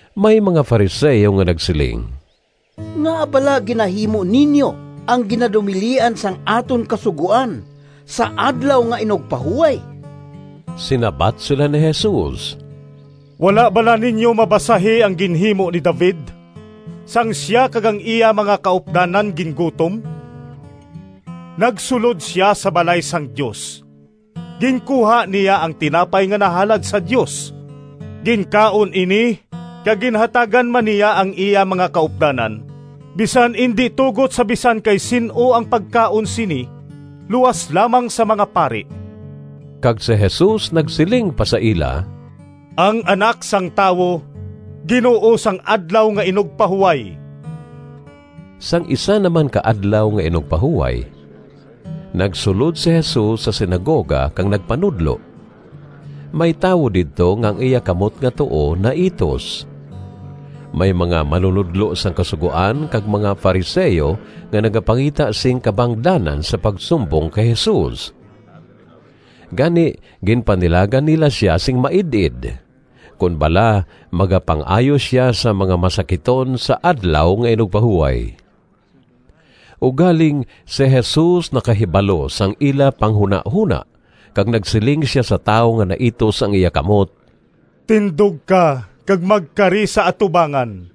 May mga Fariseo nga nagsiling, “Ngaa bala ginahimo ninyo ang ginadumilian sang aton Kasugoan sa Adlaw nga Inugpahuway?” Sinabat sila ni Jesus, “Wala bala ninyo mabasahi ang ginhimo ni David sang sia kag ang iya mga kaupdanan gingutom? Nagsulod sia sa balay sang Dios, ginkuha niya ang tinapay nga nahalad sa Dios, ginkaon ini, kag ginhatagan man niya ang iya mga kaupdanan, bisan indi tugot sa bisan kay sin-o ang pagkaon sini luas lamang sa mga pari.” Kag si Jesus nagsiling pa sa ila, “Ang Anak sang Tawo Ginoo sang Adlaw nga Inugpahuway.” Sang isa na man ka Adlaw nga Inugpahuway, nagsulod si Jesus sa sinagoga kag nagpanudlo. May tawo didto nga ang iya kamot nga tuo naitus. May mga manunodlo sang Kasugoan kag mga Fariseo nga nagapangita sing kabangdanan sa pagsumbong kay Jesus. Gani ginpanilagan nila sia sing maid-id kon bala magapang-ayo sia sang mga masakiton sa Adlaw nga Inugpahuway. Ugaling si Jesus nakahibalo sang ila panghunahona kag nagsiling sia sa tawo nga naitus ang iya kamot, “Tindog ka kag magkari sa atubangan.”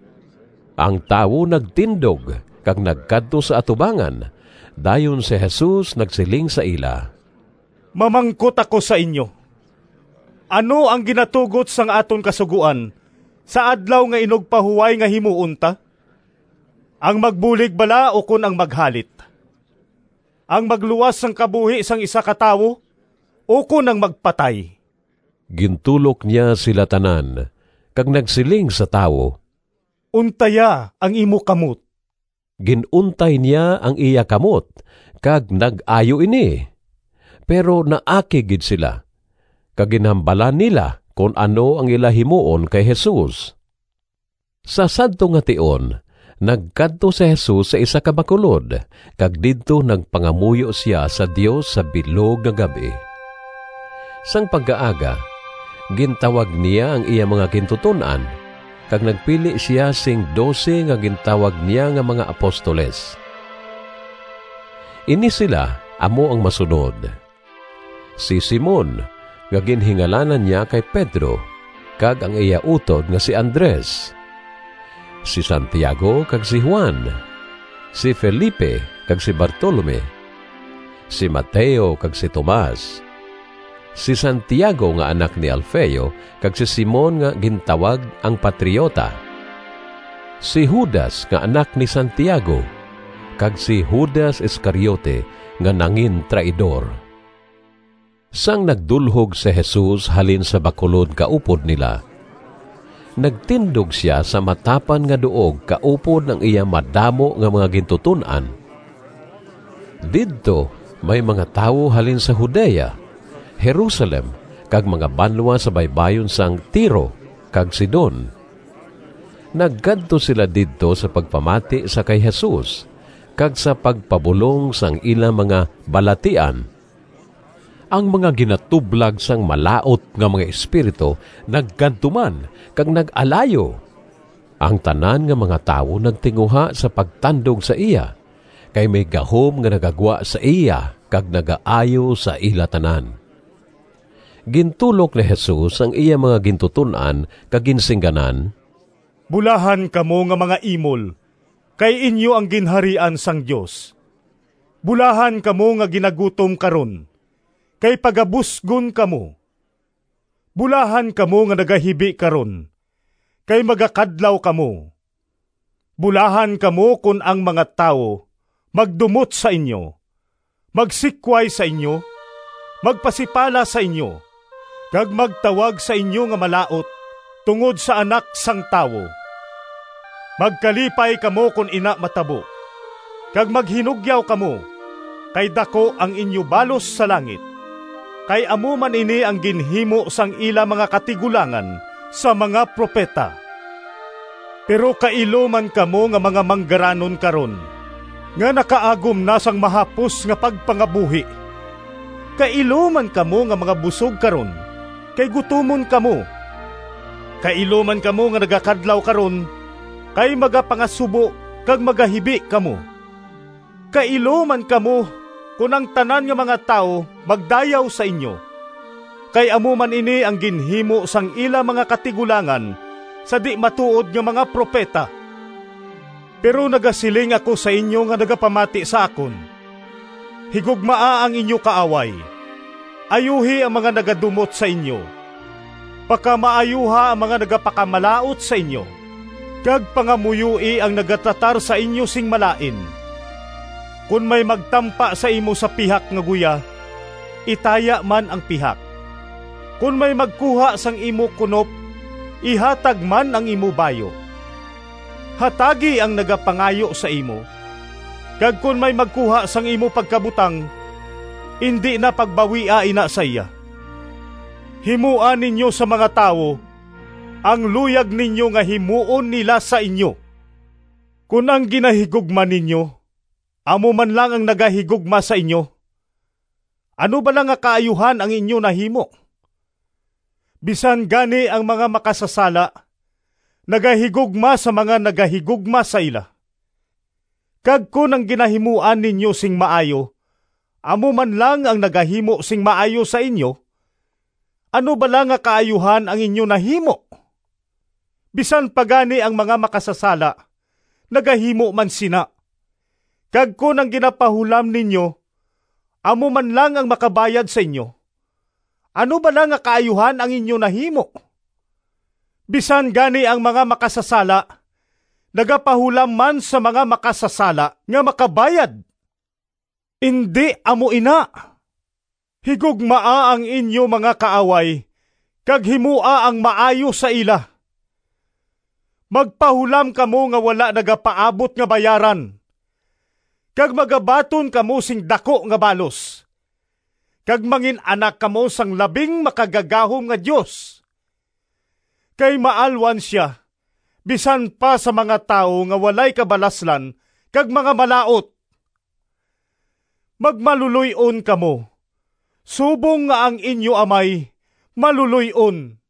Ang tawo nagtindog kag nagkadto sa atubangan. Dayon si Jesus nagsiling sa ila, “Mamangkot ako sa inyo: Ano ang ginatugot sang aton Kasugoan sa Adlaw nga Inugpahuway nga himuon ta? Ang magbulig bala ukon ang maghalit? Ang magluwas sang kabuhi sang isa ka tawo ukon ang magpatay?” Gintulok niya sila tanan, kag nagsiling sa tawo, “Untaya ang imo kamot.” Gin-untay niya ang iya kamot, kag nag-ayo ini. Pero naakig gid sila, kag ginhambalan nila kon ano ang ila himuon kay Jesus. Sa sadto nga tion nagkadto si Jesus sa isa ka bakulod kag didto nagpangamuyo sia sa Dios sa bilog nga gab-i. Sang pagkaaga gintawag niya ang iya mga gintuton-an, kag nagpili sia sing dose nga gintawag niya nga mga apostoles. Ini sila amo ang masunod: si Simon nga ginhingalanan niya kay Pedro kag ang iya utod nga si Andres, si Santiago kag si Juan, si Felipe kag si Bartolome, si Mateo kag si Tomas, si Santiago nga anak ni Alfeo kag si Simon nga gintawag ang patriota, si Judas nga anak ni Santiago kag si Judas Iscariote nga nangintraidor. Sang nagdulhog si Jesus halin sa bakulod kaupod nila, nagtindog sia sa matapan nga duog kaupod ang iya madamo nga mga gintuton-an. Didto may mga tawo halin sa Judea, Jerusalem kag mga banwa sa baybayon sang Tiro kag Sidon. Nagkadto sila didto sa pagpamati sa kay Jesus kag sa pagpabulong sang ila mga balatian. Ang mga ginatublag sang malaut nga mga espiritu nagkadto man kag nag-alayo. Ang tanan nga mga tawo nagtinguha sa pagtandog sa iya, kay may gahom nga nagagwa sa iya kag nagaayo sa ila tanan. Gintulok ni Jesus ang iya mga gintuton-an kag ginsingganan: “Bulahan kamo nga mga imol, Kay inyo ang Ginharian sang Dios! “Bulahan kamo nga ginagutom karon, Kay pagabusgon kamo! “Bulahan kamo nga nagahibi karon, Kay magakadlaw kamo! “Bulahan kamo kon ang mga tawo magdumot sa inyo, magsikway sa inyo, magpasipala sa inyo, kag magtawag sa inyo nga malaut tungod sa Anak sang Tawo. Magkalipay kamo kon ina matabo, kag maghinugyaw kamo, kay daku ang inyo balos sa langit. Kay amo man ini ang ginhimo sang ila mga katigulangan sa mga propeta. “Pero kailo man kamo Nga mga manggaranon karon, Nga nakaagom na Sang mahapos nga pagpangabuhi! “Kailo man kamo Nga mga busog karon, Kay gutomon kamo! “Kailo man kamo Nga nagakadlaw karon, Kay magapangasubo Kag magahibi kamo! “Kailo man kamo kon ang tanan nga mga tawo magdayaw sa inyo, kay amo man ini ang ginhimo sang ila mga katigulangan sa di-matuod nga mga propeta.” “Pero nagasiling ako sa inyo nga nagapamati sa akon: Higugmaa ang inyo kaaway, ayuhi ang mga nagadumot sa inyo, pakamaayuha ang mga nagapakamalaut sa inyo, kag pangamuyoi ang nagatratar sa inyo sing malain. Kon may magtampa sa imo sa pihak nga guya, itaya man ang pihak. Kon may magkuha sang imo kunop, ihatag man ang imo bayu. Hatagi ang nagapangayo sa imo, kag kon may magkuha sang imo pagkabutang, indi na pagbawia ina sa iya. Himoa ninyo sa mga tawo ang luyag ninyo nga himuon nila sa inyo. “Kon ang ginahigugma ninyo amo man lang ang nagahigugma sa inyo, ano bala nga kaayuhan ang inyo nahimo? Bisan gani ang mga makasasala nagahigugma sa mga nagahigugma sa ila. Kag kon ang ginahimuan ninyo sing maayo amo man lang ang nagahimo sing maayo sa inyo, ano bala nga kaayuhan ang inyo nahimo? Bisan pa gani ang mga makasasala nagahimo man sina! Kag kon ang ginapahulam ninyo amo man lang ang makabayad sa inyo, ano bala nga kaayuhan ang inyo nahimo? Bisan gani ang mga makasasala nagapahulam man sa mga makasasala nga makabayad. Indi amo ina! Higugmaa ang inyo mga kaaway kag himoa ang maayo sa ila. Magpahulam kamo nga wala nagapaabot nga bayaran. Kag magabaton kamo sing daku nga balos, kag mangin-anak kamo sang Labing Makagagahom nga Dios. Kay maalwan sia bisan pa sa mga tawo nga walay kabalaslan kag mga malaut. Magmaluloy-on kamo, subong nga ang inyo Amay maluloy-on.”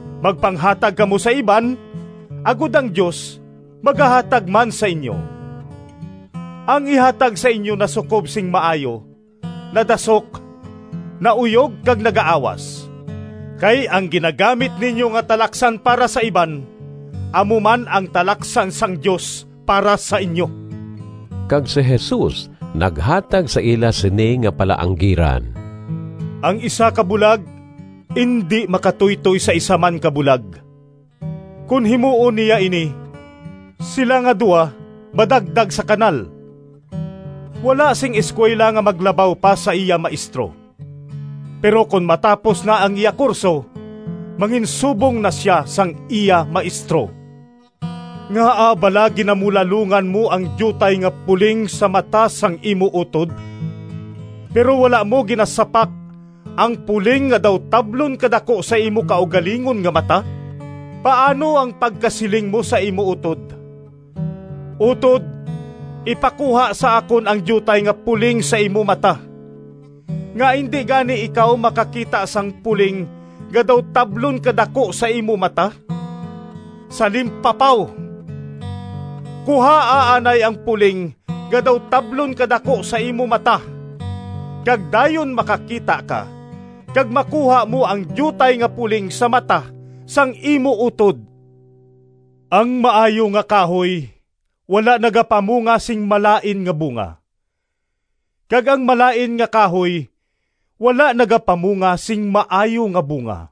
Magpanghatag kamo sa iban, agod ang Dios magahatag man sa inyo. Ang ihatag sa inyo nasukob sing maayo, nadasok, nauyog kag nagaawas. Kay ang ginagamit ninyo nga talaksan para sa iban amo man ang talaksan sang Dios para sa inyo.” Kag si Jesus naghatag sa ila sini nga palaanggiran: “Ang isa ka bulag indi makatuytoy sa isa man ka bulag, kon himuon niya ini, sila nga duha madagdag sa kanal. Wala sing eskuwela nga maglabaw pa sa iya maestro; pero kon matapos na ang iya kurso manginsubong na sia sang iya maestro. “Ngaa bala ginamulalongan mo ang diutay nga puling sa mata sang imo utod, pero wala mo ginasapak ang puling nga daw tablon kadaku sa imo kaugalingon nga mata? Paano ang pagkasiling mo sa imo utod, ‘Utod, ipakuha sa akon ang diutay nga puling sa imo mata,’ nga indi gani ikaw makakita sang puling nga daw tablon kadaku sa imo mata? Salimpapaw! Kuhaa anay ang puling nga daw tablon kadaku sa imo mata, kag dayon makakita ka kag makuha mo ang diutay nga puling sa mata sang imo utod.” “Ang maayo nga kahoy wala nagapamunga sing malain nga bunga, kag ang malain nga kahoy wala nagapamunga sing maayo nga bunga.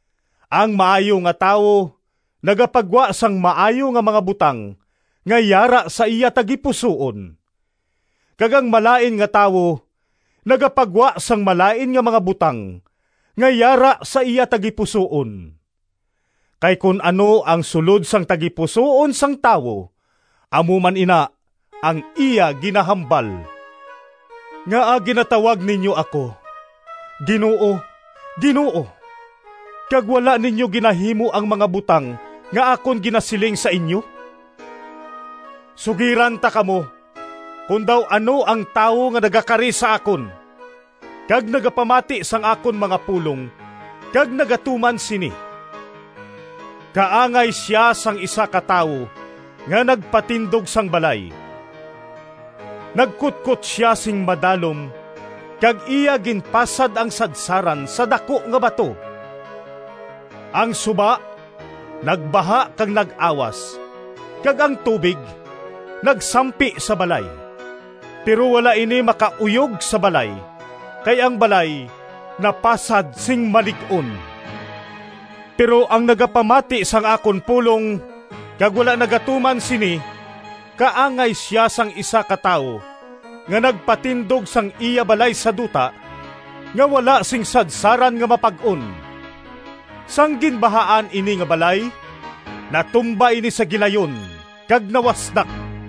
Ang maayo nga tawo nagapagwa sang maayo nga mga butang nga yara sa iya tagipusoon, kag ang malain nga tawo nagapagwa sang malain nga mga butang nga yara sa iya tagipusoon. Kay kon ano ang sulod sang tagipusoon sang tawo amo man ina ang iya ginahambal.” “Ngaa ginatawag ninyo ako, ‘Ginoo, Ginoo,’ kag wala ninyo ginahimo ang mga butang nga akon ginasiling sa inyo? Sugiran ta kamo kon daw ano ang tawo nga nagakari sa akon, kag nagapamati sang akon mga pulong kag nagatuman sini: Kaangay sia sang isa ka tawo nga nagpatindog sang balay. Nagkutkot sia sing madalom kag iya ginpasad ang sadsaran sa daku nga bato. Ang suba nagbaha kag nag-awas kag ang tubig nagsampi sa balay, pero wala ini makauyog sa balay kay ang balay napasad sing malig-on. Pero ang nagapamati sang akon pulong kag wala nagatuman sini kaangay sia sang isa ka tawo nga nagpatindog sang iya balay sa duta, nga wala sing sadsaran nga mapag-on. Sang ginbahaan ini nga balay natumba ini sa gilayon, kag nawasdak.”